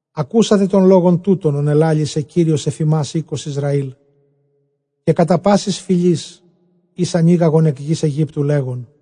Ἀκούσατε τὸν λόγον τοῦτον, ὃν ἐλάλησε Κύριος ἐφʼ ὑμᾶς, οἶκος Ἰσραὴλ, καὶ κατὰ πάσης φυλῆς, ἧς ἀνήγαγον ἐκ γῆς Αἰγύπτου, λέγων,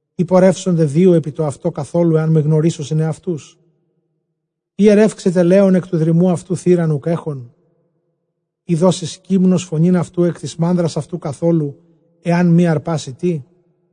Εἰ πορεύσονται δύο ἐπιτοαυτὸ καθόλου, ἐὰν μὴ γνωρίσωσιν ἑαυτούς; Εἰ ἐρεύξεται λέων ἐκ τοῦ δρυμοῦ αὐτοῦ θήραν οὐκ ἔχων; εἰ δώσει σκύμνος φωνὴν αὐτοῦ ἐκ τῆς μάνδρας αὐτοῦ καθόλου, ἐὰν μὴ ἁρπάσῃ τί;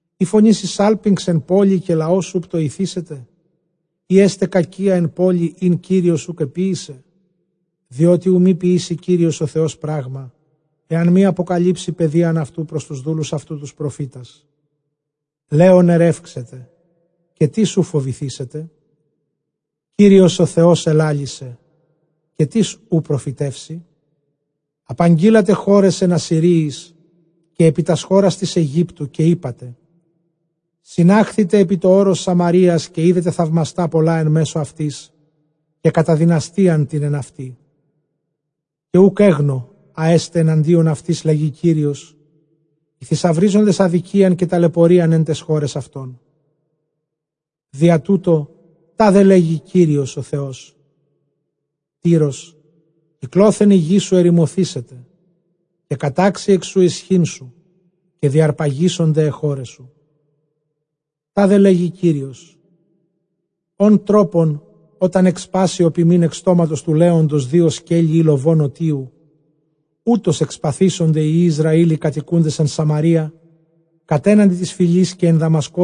Εἰ φωνήσει σάλπιγξ ἐν πόλει, καὶ λαὸς οὐ πτοηθήσεται; εἰ ἔσται κακία ἐν πόλει ἣν Κύριος οὐκ ἐποίησε; Διότι οὐ μὴ ποιήσῃ Κύριος ὁ Θεὸς πρᾶγμα ἐὰν μὴ ἀποκαλύψῃ παιδείαν πρὸς τοὺς δούλους αὐτοῦ τοὺς προφήτας. Λέων ἐρεύξεται, καὶ τίς οὐ φοβηθήσεται; Κύριος ὁ Θεὸς ἐλάλησε, καὶ τίς οὐ προφητεύσει; Ἀναγγείλατε χώραις ἐν Ἀσσυρίοις, καὶ ἐπὶ τὰς χώρας τῆς Αἰγύπτου, καὶ εἴπατε, συνάχθητε ἐπὶ τὸ ὄρος Σαμαρείας, καὶ ἴδετε θαυμαστὰ πολλὰ ἐν μέσῳ αὐτῆς, καὶ καταδυναστείαν τὴν ἐν αὐτῇ. Καὶ οὐκ ἔγνω ἃ ἔσται ἐναντίον αὐτῆς, λέγει Κύριος, οἱ θησαυρίζοντες ἀδικίαν καὶ ταλαιπωρίαν ἐν ταῖς χώραις αὐτῶν. Διατοῦτο τάδε λέγει Κύριος ὁ Θεὸς, Τύρος κυκλόθεν ἡ γῆ σου ἐρημωθήσεται, καὶ κατάξει ἐκ σοῦ ἰσχύν σου, καὶ διαρπαγήσονται αἱ χῶραί σου. Τάδε λέγει Κύριος, ὃν τρόπον ὅταν ἐκσπάσῃ ὁ ποιμὴν ἐκ στόματος τοῦ λέοντος δύο σκέλη ἢ λοβὸν ὠτίου, οὕτως ἐκσπασθήσονται οἱ υἱοὶ Ἰσραὴλ οἱ κατοικοῦντες ἐν Σαμαρείᾳ κατέναντι τῆς φυλῆς, καὶ ἐν Δαμασκῷ.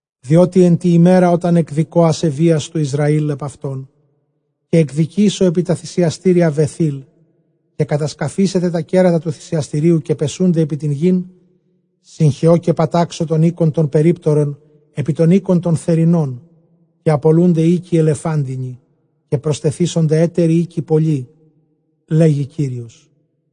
Διότι ἐν τῇ ἡμέρᾳ ὅταν ἐκδικῶ ἀσεβείας τοῦ Ἰσραὴλ ἐπʼ αὐτὸν, καὶ ἐκδικήσω ἐπὶ τὰ θυσιαστήρια Βαιθήλ· καὶ κατασκαφήσεται τὰ κέρατα τοῦ θυσιαστηρίου, καὶ πεσοῦνται ἐπὶ τὴν γῆν· Συγχεῶ καὶ πατάξω τὸν οἶκον τὸν περίπτερον ἐπὶ τὸν οἶκον τὸν θερινὸν, καὶ ἀπολοῦνται οἶκοι ἐλεφάντινοι, καὶ προστεθήσονται ἕτεροι οἶκοι πολλοὶ, λέγει Κύριος.